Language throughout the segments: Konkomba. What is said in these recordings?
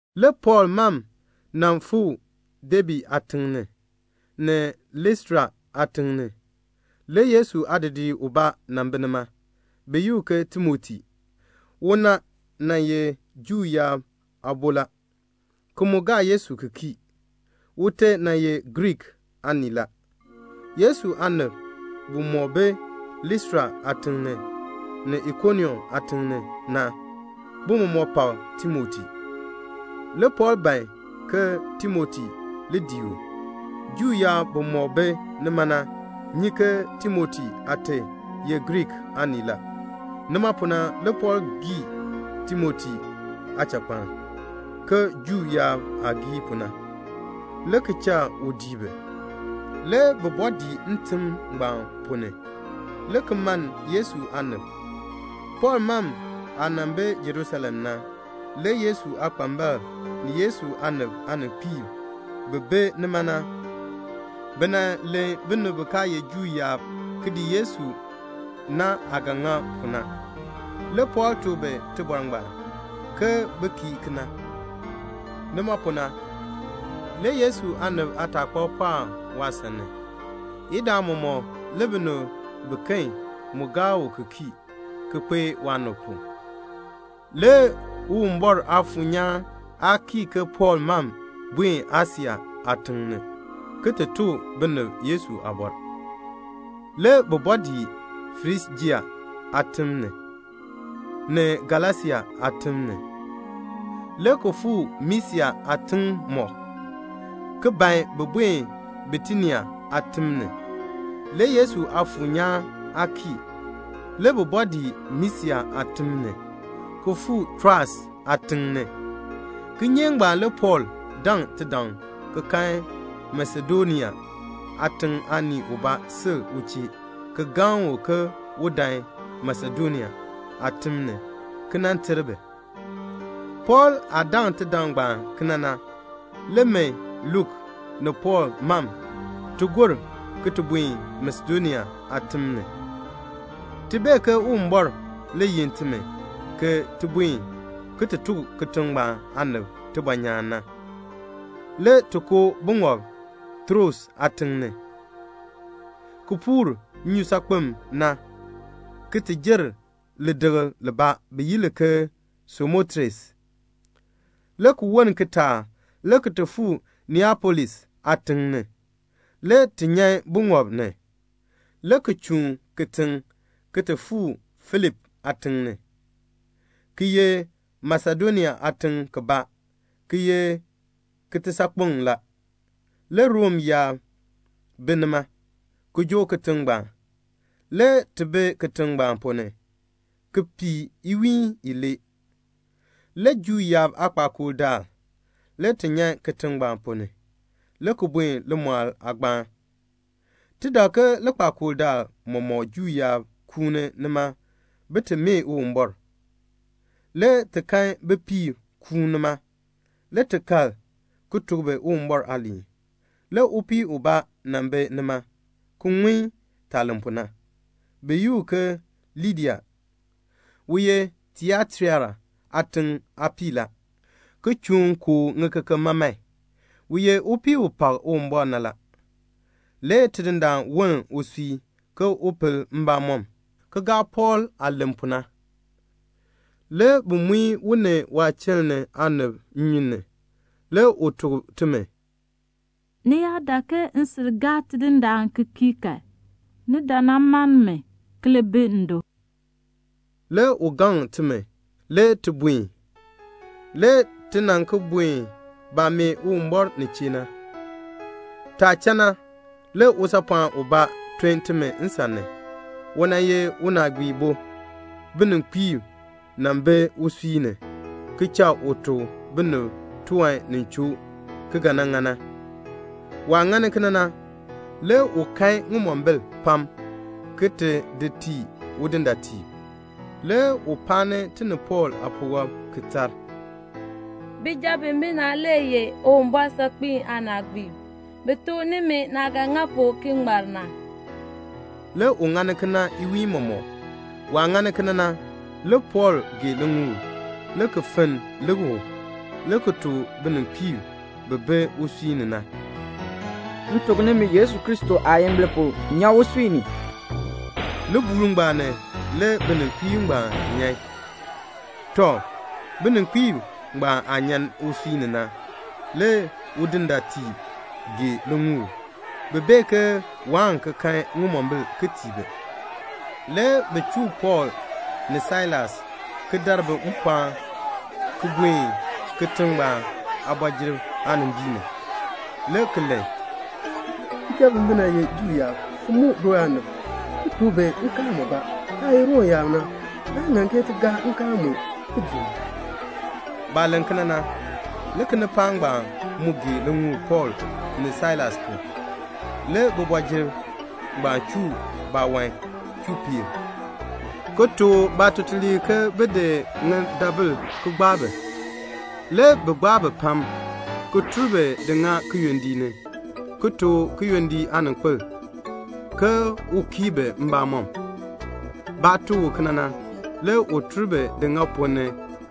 Le Pɔɔl mam nan fuu Debe aatiŋ ni, ni Listra aatiŋ ni. Le Yesu aadidiir ubaa nan bi nima. Bi yi u ke Timoti. Una nan ye Juu yaab aabo la, ki mu gaa Yesu ki kii. Ute nan ye Griik aanii la. Yesu aanib bimɔk bi Listra aatiŋ ni, ni Ikonium aatiŋ ni na, bi mɔmɔk pak Timoti. Le Pɔɔl ban ke Timoti li dii u. Juu yaab bimɔk bi nima na nyi ke Timoti aate ye Griik aanii la. Nima pu na le Pɔɔl gii Timoti aachakpaln ke Juu yaab aah gii pu na, le ki cha u dii bi. Le bi bɔɔ dii ntim ngbaan ponn ni, le ki mann Yesu aanib. Pɔɔl mam aah nan bi Jerusalem ni na, le Yesu aakpambalb ni Yesu aanib aaninkpiib bi bi nima na, bi nan len binib bi kaa ye Juu yaab ki dii Yesu na aah ga ŋa pu na. Le Pɔɔl tuk bi tibɔr ngbaan, ke bin kii kena. Nima pu na, le Yesu aanib aataakpab pɔɔk waasan ni. Idaa mɔmɔk le binib biken mu gaa u ki kii, ki kpee waanib pu. Le Uwumbɔr Aafuur nyaan aa kii ke Pɔɔl mam buen Asia aatiŋ ni ki ti tuk binib Yesu aabɔr. Le bi bɔɔ dii Frijia aatim ni, ni Galasia aatim ni, le ki fuu Misia aatiŋmɔk, ki ban bin buen Bitinia aatim ni. Le Yesu Aafuur nyaan aa kii. Le bi bɔɔ dii Misia aatim ni, ki fuu Troas aatiŋ ni. Kinyeek ngbaan le Pɔɔl daŋ tidaŋ ki kan Masedonia aatiŋ aanii ubaa sil u chee ki gaŋ u ke un dan Masedonia aatim ni ki nan ter bi. Pɔɔl aah daŋ tidaŋ ngbaan kena na, le min Luk ni Pɔɔl mam, ti gor ki ti buen Masedonia aatim ni. Ti bee ke Uwumbɔr le yin timi ke ti buen ki ti tuk kitiŋ ngbaan aanib tibɔnyaan na. Le ti koo buŋɔb Troas aatiŋ ni, ki puur nnyusaakpem na ki ti jer lidikl libaa bi yi li ke Samotres. Le ki woln kitaak le ti fuu Neapolis aatiŋ ni. Le ti nyan buŋɔb ni, le ki chuun kitiŋ ki ti fuu Filipi aatiŋ ni. Ki ye Masedonia aatiŋ kibaa, ki ye kitisaakpeŋ la. Le Rom yaab bi nima, ki joo kitiŋ ngbaan. Le ti bi kitiŋ ngbaan ponn ni, ki pii iwiin ilee. Le Juu yaab aakpakool daal, le ti nyan kitiŋ ngbaan ponn ni, le ki buen limɔɔl aagbaan. Ti dak ke likpakool daal mɔmɔk Juu yaab kuuni nima bin ti mee Uwumbɔr. Le ti kan bipiib kuun nima. Le ti kal ki tuk bi Uwumbɔr aaliin. Le upii ubaa nan bi nima ki ŋun taah len pu na. Bi yi u ke Lidia. U ye Tiataira aatiŋ aapii la, ki chuun kooh ŋikeken maman. U ye upii u pak Uwumbɔr na la. Le Tidindaan woln usui ke un pel mbamɔm, ki gaa Pɔɔl aah len pu na. Le bi muin u ni waachiln ni aanib nnyun ni. Le u tuk timi, "Ni yaa dak ke m sil gaa Tidindaan ki kii kan, ni dan nan mann mi, ki li bi ndo." Le u gaŋ timi. Le ti buen. Le ti nan ki buen baah mee Uwumbɔr nin chee na. Taah cha na, le usaapɔɔn ubaa ton timi nsan ni. U nan ye unaagbiibo. Bininkpiib nan bi usui ni, ki cha u tuk binib tiwan ni choo ki ga nan ŋa na. Waah ŋani kena na, le u kan ŋimombil pam ki ti di tii udindaatiib. Le u paani ti ni Pɔɔl aapuwɔb, ki tar, "Bijab bimina le ye Uwumbɔr saakpiin aanaagbiib. Bi tuk nimi naah ga ŋa pu ki ŋmar na." Le u ŋani kena iwiin mɔmɔk. Waah ŋani kena na, le Pɔɔl gee liŋuul, le ki fenn lik u, le ki tuk bininkpiib bi bi usui ni na, "M tuk nimi Yesu Kristo aayimbil pu, nyan usui ni." Libuul ngbaan ni le bininkpiib ngbaan nyan. Tɔ, bininkpiib ngbaan aah nyan usui ni na, le udindaatiib gee liŋuul. Bi bee ke waan ki kan ŋimombil ki tii bi. Le bi chuu Pɔɔl ni Sailas ki dar bi mpɔɔn ki buen kitiŋ ngbaan aabɔjir aanimbiin ni, le ki len, "Bijab bimina ye Juu yaab, ki muk du aanib, ki tuk bi nkaal mubaa. Taah ye Rom yaab na, naa ŋan ti gaa nkaal mue ki dii." Baah len kena na, le kinipaak ngbaan mu gee liŋuul Pɔɔl ni Sailas pu. Le bibɔjir ngbaan chuu baawan chuu peer, ki tuk baatutuliib ke bin di ŋidabil ki gbaa bi. Le bi gbaa bi pam, ki tur bi ti di ŋa kiyondiik ni, ki tuk kiyondiik aaninkpil ke un kii bi mbamɔm. Baah tuk u kena na, le u tur bi di ŋa ponn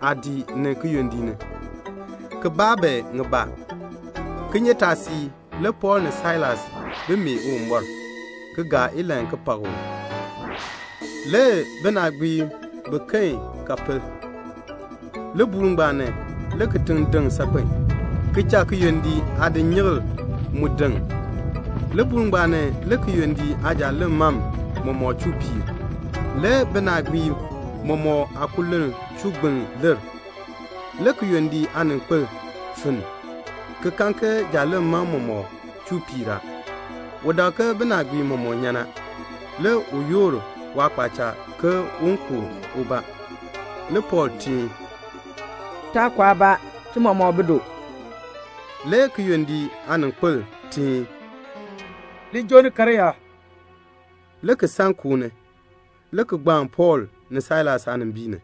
aadiik ni kiyondiik ni, ki baa bi ŋibaa. Kinyeetaasiik le Pɔɔl ni Sailas bi mee Uwumbɔr, ki gaa ilahn ki pak u. Le binaagbiib biken ka pel. Libuul ngbaan ni le kitiŋ deŋ saakpen, ki cha kiyondiik aadinyikl mu deŋ. Libuul ngbaan ni le kiyondiik aajaaleŋ mam mɔmɔk chuu piir. Le binaagbiib mɔmɔk aakululn chuu gbiln leer. Le kiyondiik aaninkpil finn, ki kan ke jaaleŋ mam mɔmɔk chuu piir a. U dak ke binaagbiib mɔmɔk nyan a. Le u yoor waakpaacha ke un ku ubaa. Le Pɔɔl teen, "Taa ku aabaa. Ti mɔmɔk bi du." Le kiyondiik aaninkpil teen, "Li joo ni karyaa," le ki san koo ni, le ki gbaan Pɔɔl ni Sailas aanimbiin ni,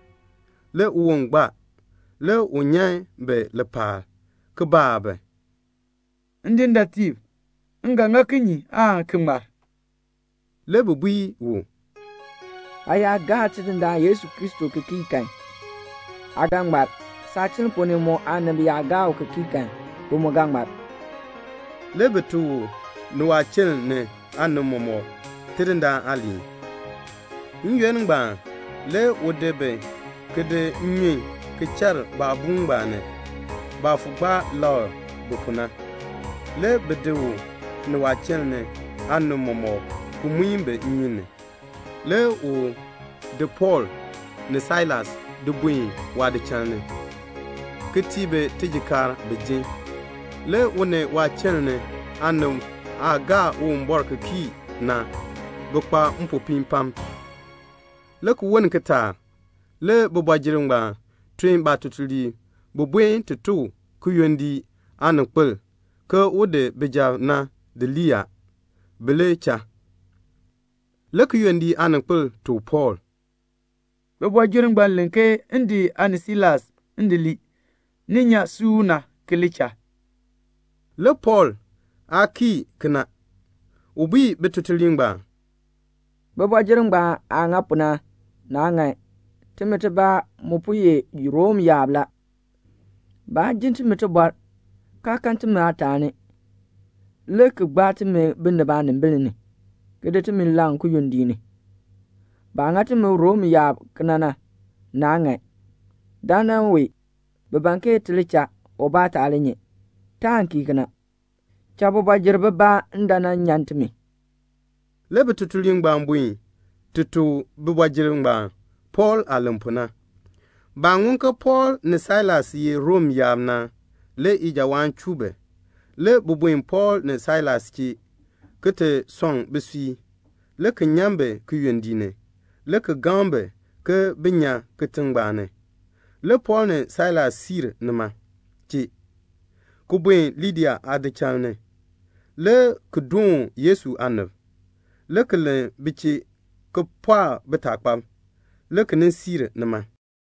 le uwon gbaa. Le u nyan bi lipaal, ki baa bi, "Ndindaatiib, m ga ŋa kinye aan ki ŋmar?" Le bi bui u, "Aa yaa gaa Tidindaan Yesu Kristo ki kii kan, aa ga ŋmar. Saachiln ponn ni mu aanib yaa gaa u ki kii kan, bi mu ga ŋmar." Le bi tuk u ni waachiln ni aanib mɔmɔk Tidindaan aaliin. N-yoonn ngbaan le u di bi ki di nnyun ki char baabuun ngbaan ni, baah fo gbaa lakr bi pu na. Le bi di u ni waachiln ni aanib mɔmɔk ki muin bi nnyun ni. Le u di Pɔɔl ni Sailas di buen waadichal ni, ki tii bi tijikaar bin jin. Le u ni waachiln ni aanib aah gaa Uwumbɔr ki kii na, bi kpa mpopiin pam. Le ki woln kitaak le bibɔjir ngbaan tun baatutuliib bin buen ti tuk kiyondiik aaninkpil ke un di bijab na di lii a, bi li cha. Le kiyondiik aaninkpil tuk Pɔɔl, "Bibɔjir ngbaan len ke m di aa ni Sailas di lii, ni li cha. Ni nyan suuna ki li cha." Le Pɔɔl aa kii kena. U bui bitutuliib ngbaan, "Bibɔjir ngbaan aah ŋa pu na, naa ŋan. Timi tibaa mu po ye Rom yaab la. Baa jin timi tibɔr, kaa kan timi aataani, le ki gbaa timi binib aanimbil ni, ki di timi laŋ kiyondiik ni. Baah ŋa timi Rom yaab kena na, naa ŋan. Dandana wee bi ban ti li cha, ubaa taa li nyi. Taan kii kena. Cha bibɔjir bibaa dan nan nyan timi." Le bitutuliib ngbaan buen ti tuk bibɔjir ngbaan Pɔɔl aah len pu na. Baah ŋun ke Pɔɔl ni Sailas ye Rom yaab na, le ijawaan chuu bi. Le bi buen Pɔɔl ni Sailas chee ki ti sɔŋ bisui, le ki nyan bi kiyondiik ni, le ki gaŋ bi ke bin nyan kitiŋ ngbaan ni. Le Pɔɔl ni Sailas siir nima chee, ki buen Lidia aadichal ni, le ki doon Yesu aanib, le ki len bi chee ki pɔɔk bitaakpab, le ki nin siir nima.